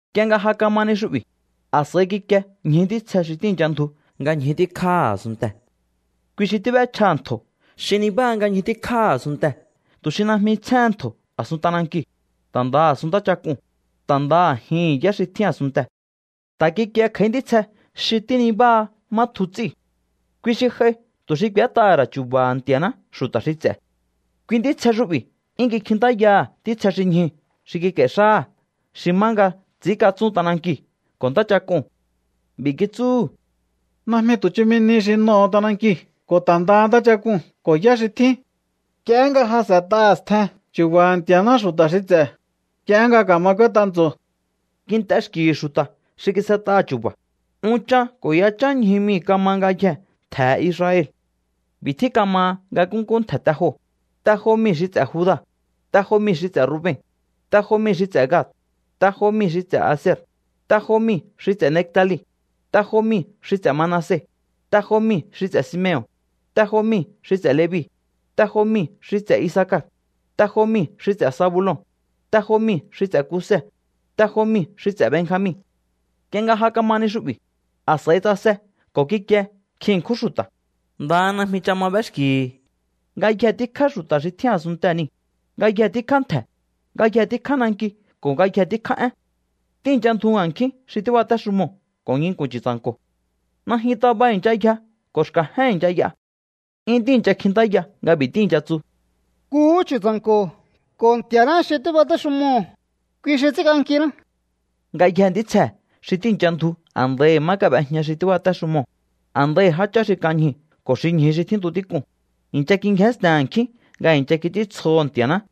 Nk'ie nga ja kama ni xu'bi̱, a̱s'a̱i kikie ñju ntítsje xi tíi̱ncha ndju nga ñju tíkjáha̱ a̱sunntee̱. Kui xi tíb'échjaha̱ ntjo̱ xi nibáha nga ñju tíkjáha̱ a̱sunntee̱ tu̱ xi najmi tsjéhen ntjo̱ a̱sun t'anankiu̱, ta̱ ndaha a̱sun ntáchak'uu̱n, ta̱ ndaha a̱jihi̱n yá xi tjín a̱sunntee̱. Ta̱ kikie kj'a̱í ntítsje xi tínibáha má tju ts'íu̱. Kui xi j'ai tu̱ xi k'u̱ét'aha̱ ra̱ chu̱ba̱ha̱ Nti̱a̱ná xu̱ta̱ xi ts'e̱. Kui ntítsje xu'bi̱ 'yún kikjintáyaha̱ ntítsje xi ñjuu̱ xi kik'a̱i̱hi̱ xáha̱ xi má nga ts'i̱ínkatsún t'anankiu̱ ko̱ ntáchak'uu̱n. B'i̱ kitsúhu̱: —Najmi tu̱ chumi nihi xi n'oho̱o t'anankiu̱ ko̱ ta̱ ndaha ntáchak'uu̱n ko̱ yá xi tjín. Nk'iehé nga ja s'e̱t'aha̱ stjen chu̱ba̱ha̱ Nti̱a̱ná xu̱ta̱ xi ts'e̱, nk'iehé nga ka̱ma k'úét'a ntso̱o. Kint'e xki̱hi̱ xu̱ta̱ xi kis'et'aha̱ chu̱ba̱. Unchan ko̱ yachán ñju mii̱ kama ngayjee̱ ntje̱he̱ Israel. B'i̱ tjín kamaha nga nkúnkú ntje̱ te joo̱: te jo mii̱ xi ts'e̱ Juda, te jo mii̱ xi ts'e̱ Ruben, te jo mii̱ xi ts'e̱ Gad, te jo mii̱ xi ts'e̱ Aser, te jo mii̱ xi ts'e̱ Neftali, te jo mii̱ xi ts'e̱ Manase, te jo mii̱ xi ts'e̱ Simeon, te jo mii̱ xi ts'e̱ Levi, te jo mii̱ xi ts'e̱ Isacar, te jo mii̱ xi ts'e̱ Zabulon, te jo mii̱ xi ts'e̱ Kuse, ko̱ te jo mii̱ xi ts'e̱ Benjamin. Nk'ie nga ja kama ni xu'bi̱, a̱s'a̱i tsase ko̱ kikie nkjin ṉkjún xu̱ta̱. Ndaha najmi ch'a ma b'éxki̱hi̱. Ngayje tíkjá xu̱ta̱ xi tjín a̱sunntee̱ niu̱, ngayje tíkjá ntje̱, ngayje tíkjá nanki ko̱ ngayje tíkjá én. Tíi̱ncha ndju a̱nkjín xi tíbatéxumoo̱ ko̱ nginku̱n Chu̱tsa̱nko̱. Najyun taba i̱ncha yja ko̱ xka̱jén i̱ncha y'a. 'Yún tíi̱ncha kjintáya nga b'i̱ tíi̱ncha tsu: ¡Nkuhú Chu̱tsa̱nko̱ ko̱ Nti̱a̱ná xi tíbatéxumoo̱, kui xi ts'ínk'ankiná! Ngayjee̱ ntítsjee̱ xi tíi̱ncha ndju a̱ndaihi̱ má kab'ejña xi tíbatéxumoo̱, a̱ndaihi̱ jáchá xi kan ñjuu̱ ko̱ xi ñju xi tjíntu tík'uu̱n, i̱ncha kingjénsten a̱nkjín nga i̱ncha kits'íntsjoho̱ Nti̱a̱ná.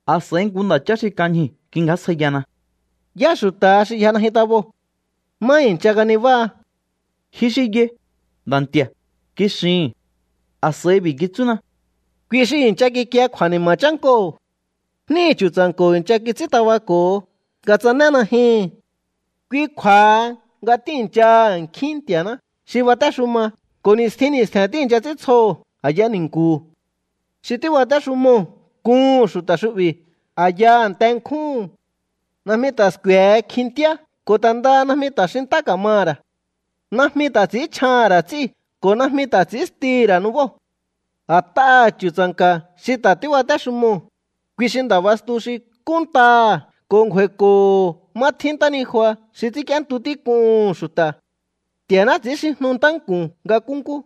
A̱s'a̱i nku nda̱chá xi kan ñjuu̱ kingjásjaiyana: —¿Yá xu̱ta̱ha xi yja najyun taboo̱? ¿Má i̱ncha kanibáha? —Ji xi yai, Nda̱ Nti̱a̱ —kixihi̱n. A̱s'a̱i b'i̱ kitsúna: —Kui xi i̱ncha kikie kju̱a̱ni̱ma̱ chánkoo̱. Jníhi̱ Chu̱tsa̱nko̱ i̱ncha kits'ín tabako̱ho nga tsané najyuhu̱n. Kui kju̱a̱ha nga tíi̱nchaha a̱nkjín Nti̱a̱ná xi batéxuma ko̱ ni̱stjin ni̱stje̱n tíi̱ncha ts'íntsjoho̱ a̱ya ni̱nku̱hu̱. Xi tíbatéxumoo̱ kuhu̱n xu̱ta̱ xu'bi̱ a̱ya a̱nte nkjúhu̱n. Najmi ta̱ sku̱e̱he kjintíá ko̱ ta̱ ndaha najmi ta̱ xintá ka̱maha̱ ra̱. Najmi ta̱ ts'i̱ínchjaha̱n ra̱ ts'íu̱ ko̱ najmi ta̱ ts'i̱ínstihi̱ ra̱ nubóo̱. A̱t'aha̱ Chu̱tsa̱nka̱ xi ta̱ tíbatéxumoo̱, kui xi nda̱ bastu xi kúnntaha̱ ko̱ ngju̱a̱i̱ko̱ho̱ má tjín ntánijua xi ts'ínk'íéntu tík'uhu̱n xu̱ta̱. Nti̱a̱ná ts'i̱ínxijnu ntánku̱n nga nkúnkú.